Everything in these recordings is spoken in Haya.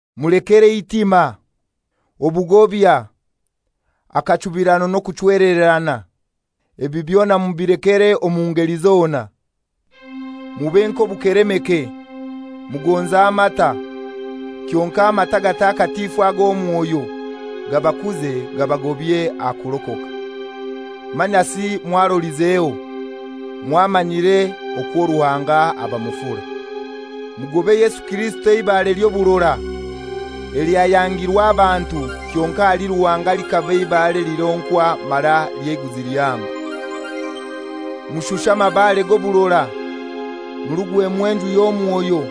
Mulekere eitima, obugobya, akachubirano n'okuchwelererana. Ebi byona mubilekere omu ngeli zona. Mube nk'obukelemeke, mugonze amata, kyonkai amata agatakatifu ag'omwoyo, gabakuze gabagobye aha kurokoka. Manyasi mwarolizeho, mwamanyire okwo Ruhanga aba mufura. Mugobe Yesu Kirisito eibare ly'oburora, elyayangirwe abantu, kyonkai ahali Ruhanga likaba ibare elironkwa mara ely'eiguzi lihango. Mushushe amabaare g'oburora, murugwemu enju y'omwoyo,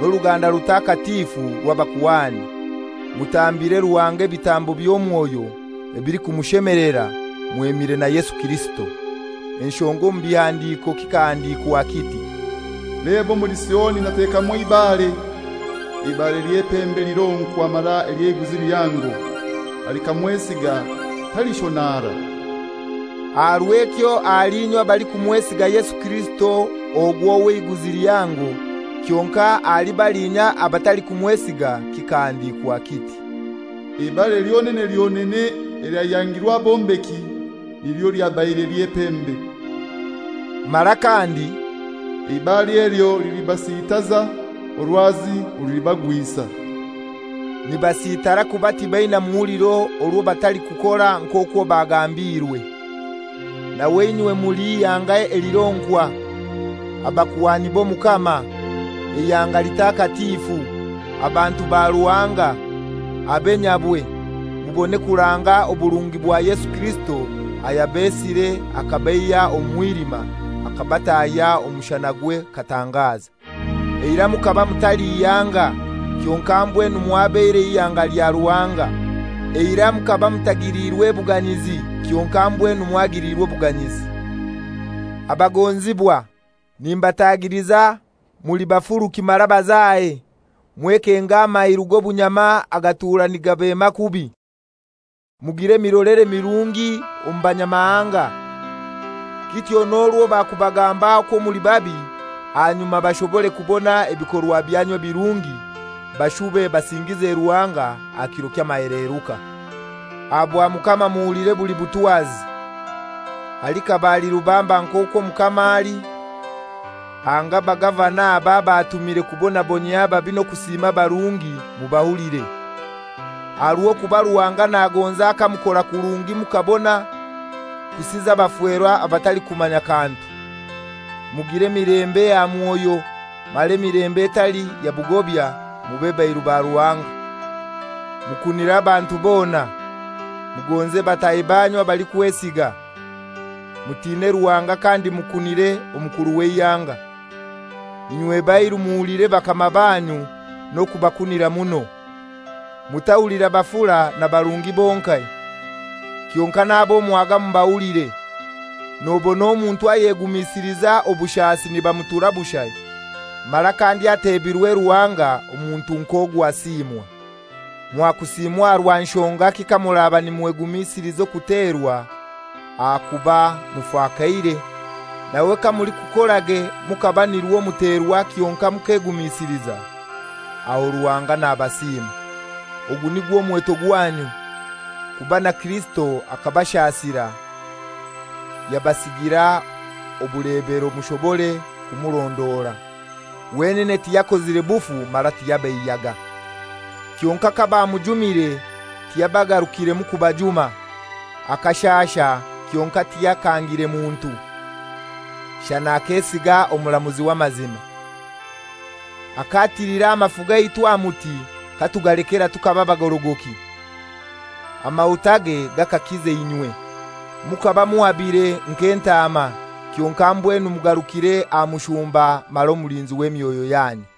n'oruganda rutakatifu rw'abakuhani, mutambire Ruhanga ebitambo by'omwoyo ebilikumushemelera mwemire na Yesu Kirisito. Enshonga omu bihandiko kikahandiikwa kiti, «Leba omuli Sioni natekamu eibare, eibare ly'epembe elironkwa mara ely'eiguzi lihango, alikamwesiga talishonara.» Aha rw'ekyo ahali inywe abalikumwesiga Yesu Kirisito ogwo w'eiguzi lihango. Kyonkai ahali baliinya abatalikumwesiga, kikahandiikwa kiti, «Eibare lyonene lyonene elyayangirwe abombeki, nilyo lyabaire ly'epembe,» mara kandi, «Eibare elyo lilibasitaza, orwazi orulibagwisa.» Nibasitara kuba tibaina muhuliro orwo batalikukora nk'okwo bagambiirwe. Nawe inywe muli ihanga elironkwa, abakuhani b'Omukama, eihanga litakatifu, abantu ba Ruhanga, abe nyabwe, mubone kuranga oburungi bwa Yesu Kirisito ayabesire akabaihya omu mwilima, akabatahya omu mushanagwe katangaza. Eirai mukaba mutali ihanga, kyonkai mbwenu mwabaire ihanga lya Ruhanga; eirai mukaba mutagiliirwe buganyizi, kyonkai mbwenu mwagiliirwe obuganyizi. Abagonzibwa, nimbatagiliza, muli bafuruki mara bazahe, mwekenge amairu g'obunyama agatura nigabema kubi. Mugire emirolere mirungi omu Banyamahanga. Kityo n'orwo bakubagamba okwo muli babi, ahanyuma bashobore kubona ebikorwa byanyu ebirungi bashube basingize Ruhanga aha kiro ky'amaheleruka. Aha bwa Mukama muhulire buli butwazi. Alikaba ali rubamba nk'okwo omukama ali, anga abagavana abo ab'atumire kubonabonyia ababi n'okusiima abarungi, mubahulire. Aha rw'okuba Ruhanga nagonza kamukora kurungi mukabona kusiza abafera abatalikumanya kantu. Mugire emilembe aha mwoyo, mara emilembe etali ya bugobya. Mube bairu ba Ruhanga. Mukunire abantu bona. Mugonze bataahi banyu abalikwesiga. Mutine Ruhanga kandi mukunire omukuru w'eihanga. Inywe bairu muhulire bakama banyu n'okubakunira muno. Mutahulira bafura na barungi bonkai, kyonkai n'ab'omwaga mubahulire. Nobona omuntu ayegumisiliza obushasi nibamutura bushai, mara kandi ateebire Ruhanga, omuntu nk'ogwo asiimwa. Mwakusiimwa aha rwa nshongaki kamuraba nimwegumisiliza okuterwa ahakuba mufakaire? Nawe kamulikukorage mukaba nirwo muterwa kyonkai mukegumisiliza, aho Ruhanga nabasiima. Ogu nigwo mweto gwanyu, kuba na Kirisito akabashasira, yabasigira obulebero mushobore kumurondora. Wenene tiyakozire bufu mara tiyabeiyaga. Kyonkai kabamujumire tiyabagarukiremu kubajuma. Akashaasha kyonkai tiyakangire muntu; shana akesiga omuramuzi w'amazima. Akatilira amafu gaitu aha muti k'atugalekera tukaba bagorogoki. Amahutage gakakiza inywe. Mukaba muhabire nk'entaama, kyonkai mbwenu mugarukire aha Mushumba mara Omulinzi w'emyoyo yanyu.